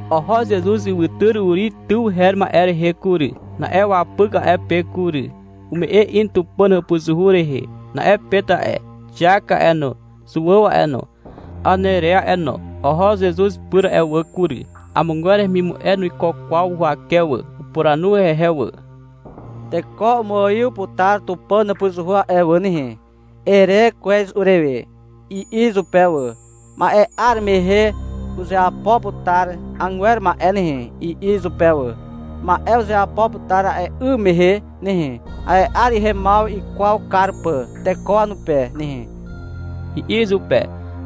Oho Zezuz ywytyr Uri tyw her ma'e rehe kury. Na'e wapyk a'e pe kury. Ume'e in Tupàn hàpuzuhu rehe. Na'e Pet a'e, Xiak a'e no, Zuàw a'e no, Anere a'e no, oho Zezuz pyr a'e wà kury. Amogwer hemimu'e nuiko kwaw huwake wà. Upuranu hehe wà. — Teko umuaiw putar Tupàn hàpuzuhu a'e wà nehe, ere kwez urewe, i'i izupe wà. — Ma'e 'ar mehe uzeapo putar agwer ma'e nehe, i'i izupe wà. — Ma'e uzeapo putar a'e 'ym mehe nehe, a'e 'ar ihemaw ikwaw kar pà teko wanupe nehe, i'i izupe.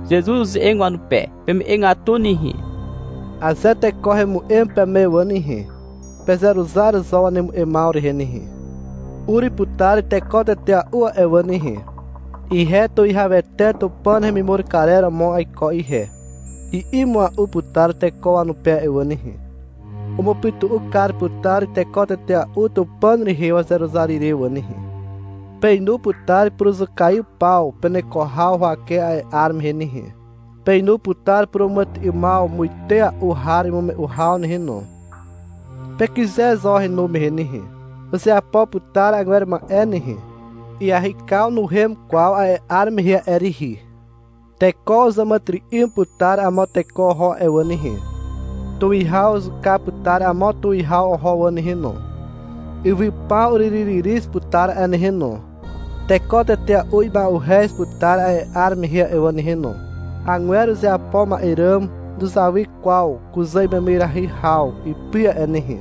Zezuz uze'eg wanupe. — Peme'egatu nehe. Aze teko hemu'em peme wà nehe, pezeruzar zo wanemu'emaw rehe nehe. Ur putar teko tetea'u a'e wà nehe. — Ihe Tuwihawete Tupàn hemimur karer romo aiko ihe, i'i mua'u putar teko wanupe a'e wà nehe. Umupytu'u kar putar teko tetea'u Tupàn rehe wazeruzar ire wà nehe. Peinu putar puruzukaiw paw peneko haw huwake a'e 'ar mehe nehe. Peinu putar puràmàtyry'ymaw muite a'u har imume'u haw nehe no. Pekyze zo henu mehe nehe. Uzeapo putar agwer ma'e nehe. Iahykaw nuhem kwaw a'e 'ar mehe a'e rihi. Teko uzàmàtyry'ym putar amo teko oho a'e wà nehe, tuwihaw uzuka putar amo tuwihaw oho wà nehe no. Ywy paw uryryryryz putar a'e nehe no. Teko tetea'u ima'uhez putar a'e 'ar mehe a'e wà nehe no. Agwer uzeapo ma'e ràm nuzawy kwaw kuzà imemyrahy haw ipy a'e nehe.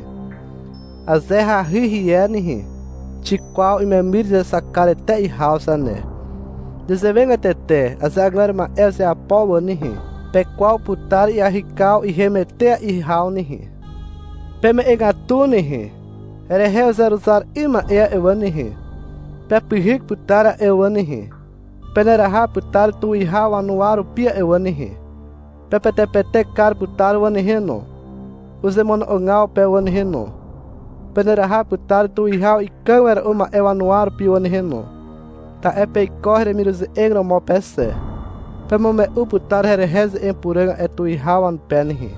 Aze hahy hie nehe, xikwaw imemyr izexak kar etea'i haw zane. Nezewegatete aze agwer ma'e uzeapo wà nehe, pekwaw putar iahykaw ihem etea'i haw nehe. Peme'egatu nehe. Herehe uzeruzar 'ym ma'e a'e wà nehe, pepyhyk putar a'e wà nehe. Peneraha putar tuwihaw wanuwa rupi a'e wà nehe. Pepetepetek kar putar wà nehe no, uzemono'ogaw pe wà nehe no. Peneraha putar tuwihaw ikàg wera'u ma'e wanuwa rupi wà nehe no. Ta'e peiko heremiruze'eg romo pe xe. Pemume'u putar herehe ze'eg puràg a'e tuwihaw wanupe nehe.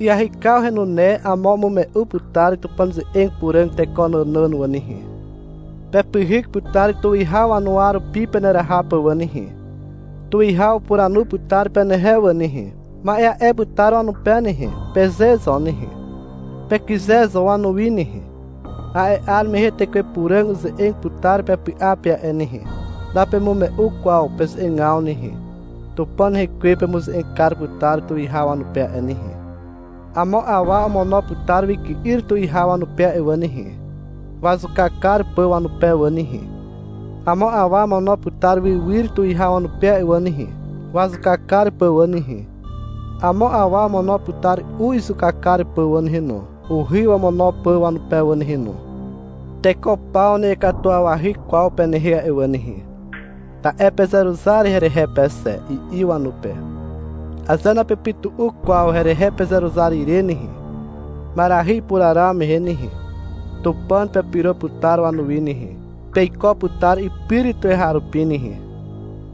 Iahykaw henune amo umume'u putar Tupàn ze'eg puràg teko nànàn wà nehe. Pepyhyk putar tuwihaw wanuwa rupi peneraha pà wà nehe. Tuwihaw upuranu putar penehe wà nehe. — Ma'e a'e putar wanupe nehe, peze zo nehe. Pekyze zo wanuwi nehe. A'e 'ar mehe Tekwe Puràg uze'eg putar pepy'a pe a'e nehe. Napemume'u kwaw peze'egaw nehe. Tupàn rekwe pemuze'eg kar putar tuwihaw wanupe a'e nehe. Amo awa omono putar wyky'yr tuwihaw wanupe a'e wà nehe, wazuka kar pà wanupe wà nehe. Amo awa omono putar wywyr tuwihaw wanupe a'e wà nehe, wazuka kar pà wà nehe. Amo awa omono putar u izuka kar pà wà nehe no, uhy wamono pà wanupe wà nehe no. Teko paw na'iakatuwawahy kwaw penehe a'e wà nehe, ta'e pezeruzar herehe pe xe, i'i wanupe. — Aze napepytu'u kwaw herehe pezeruzar ire nehe, ma'erahy ipuraraw mehe nehe, Tupàn pepyro putar wanuwi nehe. Peiko putar ipyr tuweharupi nehe.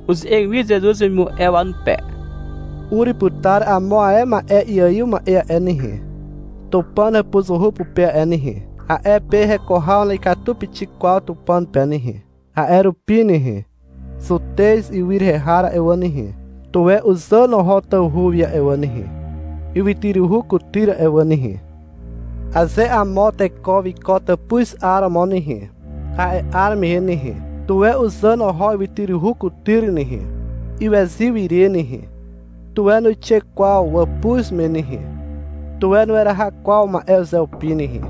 Uze'eg wi Zezuz wemimu'e wanupe. — Ur putar amo ae ma'e iaiw ma'e a'e nehe, Tupàn hàpuzuhu pupe a'e nehe. A'e pe heko haw na'ikatu pixik kwaw Tupàn pe nehe. A'e rupi nehe, Zutez ywy rehe har a'e wà nehe, tuwe uzàn oho tawhu wi a'e wà nehe, ywytyruhu kutyr a'e wà nehe. Aze amo teko wiko tàpuz 'aromo nehe, a'e 'ar mehe nehe, tuwe uzàn oho ywytyruhu kutyr nehe. Iwezyw ire nehe, tuwe nuixe kwaw wàpuz me nehe. Tuwe nueraha kwaw ma'e uzeupi nehe.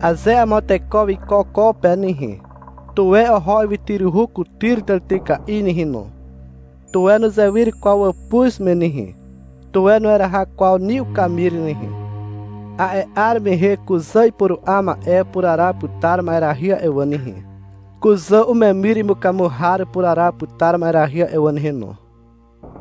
Aze amo teko wiko ko pe nehe, tuwe oho ywytyruhu kutyr tàrityka'i nehe no. Tuwe nuzewyr kwaw wàpuz me nehe. Tuwe nueraha kwaw ni ukamir nehe. A'e 'ar mehe kuzà ipuru'a ma'e upuraraw putar ma'erahy a'e wà nehe. Kuzà umemyr imukamu har upuraraw putar ma'erahy a'e wà nehe no.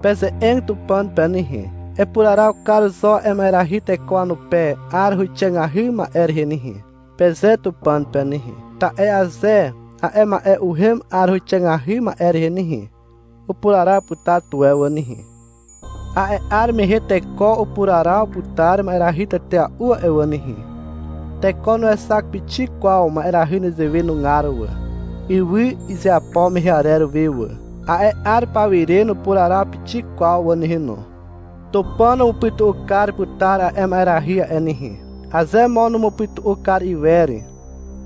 Peze'eg Tupàn pe nehe. — Epuraraw kar zo a'e ma'erahy teko wanupe 'ar huwixàgahy ma'e rehe nehe, peze Tupàn pe nehe. Ta'e aze a'e ma'e uhem 'ar huwixàgahy ma'e rehe nehe, upuraraw putar tuwe wà nehe. A'e 'ar mehe teko upuraraw putar ma'erahy tetea'u a'e wà nehe. Teko nuexak pixik kwaw ma'erahy nezewe nugar wà, ywy izeapo mehe arer we wà. A'e 'ar pawire nupuraraw pixik kwaw wà nehe no. Tupàn umupytu'u kar putar a'e ma'erahy a'e nehe. Aze mo numupytu'u kar iwer,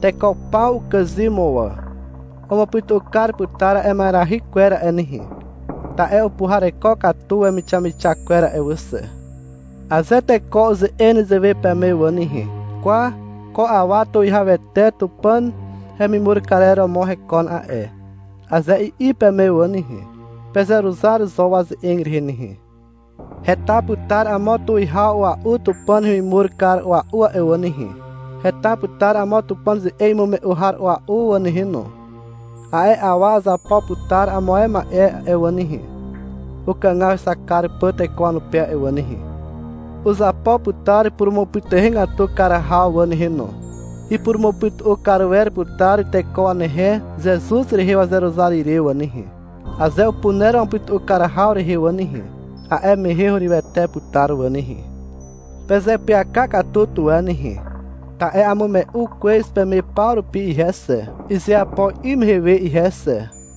teko paw ukàzym mo wà. Umupytu'u kar putar a'e ma'erahy kwer a'e nehe, ta'e upuhareko katu wemixamixak kwer a'e wà xe. Aze teko uze'eg nezewe peme wà nehe, — Kwa, ko awa Tuwihawete Tupàn hemimur karer romo hekon a'e, aze i'i peme wà nehe, pezeruzar zo waze'eg rehe nehe. Heta putar amo tuwihaw a'ua'u Tupàn hemimur kar a'ua'u a'e wà nehe. Heta putar amo Tupàn ze'eg imume'u har a'ua'u a'e wà nehe no. A'e awa uzapo putar amo ma'e a'e wà nehe, ukàgaw hexak kar pà teko wanupe a'e wà nehe. Uzapo putar purumupytuhegatu kar haw wà nehe no. Ipurumupytu'u kar wer putar teko wanehe Zezuz rehe wazeruzar ire wà nehe. Aze upuner wamupytu'u kar haw rehe wà nehe, a'e mehe hurywete putar wà nehe. Pezeapyaka katu tuwe nehe, ta'e amume'u kwez peme paw rupi ihe xe, izeapo 'ym mehe we ihe xe.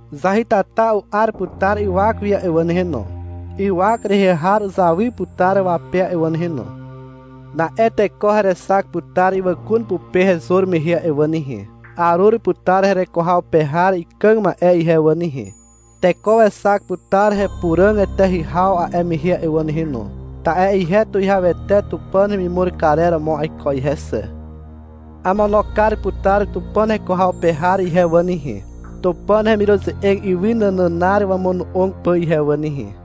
Zahytata u'ar putar ywak wi a'e wà nehe no. Ywak rehe har uzawy putar wape a'e wà nehe no. Na'e teko herexak putar ywàkun pupe hezur mehe a'e wà nehe. Arur putar hereko haw pe har ikàg ma'e ihe wà nehe. Teko wexak putar hepuràg eteahy haw a'e mehe a'e wà nehe no. Ta'e ihe Tuwihawete Tupàn hemimur karer romo aiko ihe xe. Amono kar putar Tupàn heko haw pe har ihe wà nehe, Tupàn hemiruze'eg ywy nànànar wamono'og pà ihe wà nehe.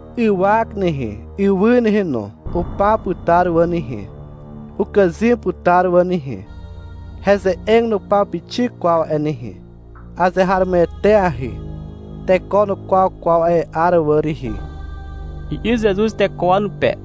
Ywak nehe, ywy nehe no, upaw putar wà nehe. Ukàzym putar wà nehe. Heze'eg nupaw pixik kwaw a'e nehe. Azeharomoeteahy. — Teko nukwaw kwaw a'e 'ar wà rihi, i'i Zezuz teko wanupe.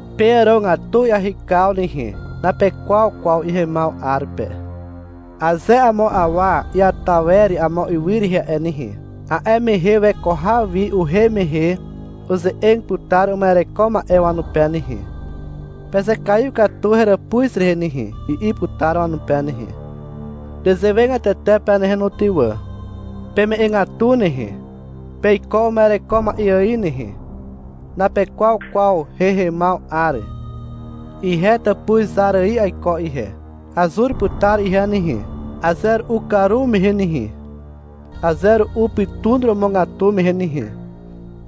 Peàrogatu iahykaw nehe. Napekwaw kwaw ihemaw 'ar pe. Aze amo awa iata wer amo ywy rehe a'e nehe, a'e mehe weko haw wi uhem mehe uze'eg putar uma'ereko ma'e wanupe nehe. — Pezekaiw katu heràpuz rehe nehe, i'i putar wanupe nehe. — Nezewegatete pe nehe no ty wà. Peme'egatu nehe. Peiko uma'ereko ma'e ài nehe. Napekwaw kwaw hehemaw 'ar. Ihe tàpuz zar ài aiko ihe. Azur putar ihe nehe. Aze ru'u karumehe nehe, aze ru'u pytun romogatu mehe nehe,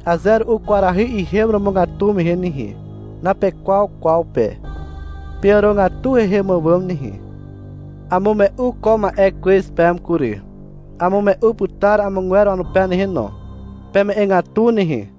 aze ru'u kwarahy ihem romogatu mehe nehe. Napekwaw kwaw pe. Peàrogatu hehem àwàm nehe. Amume'u ko ma'e kwez peme kury. Amume'u putar amogwer wanupe nehe no. Peme'egatu nehe.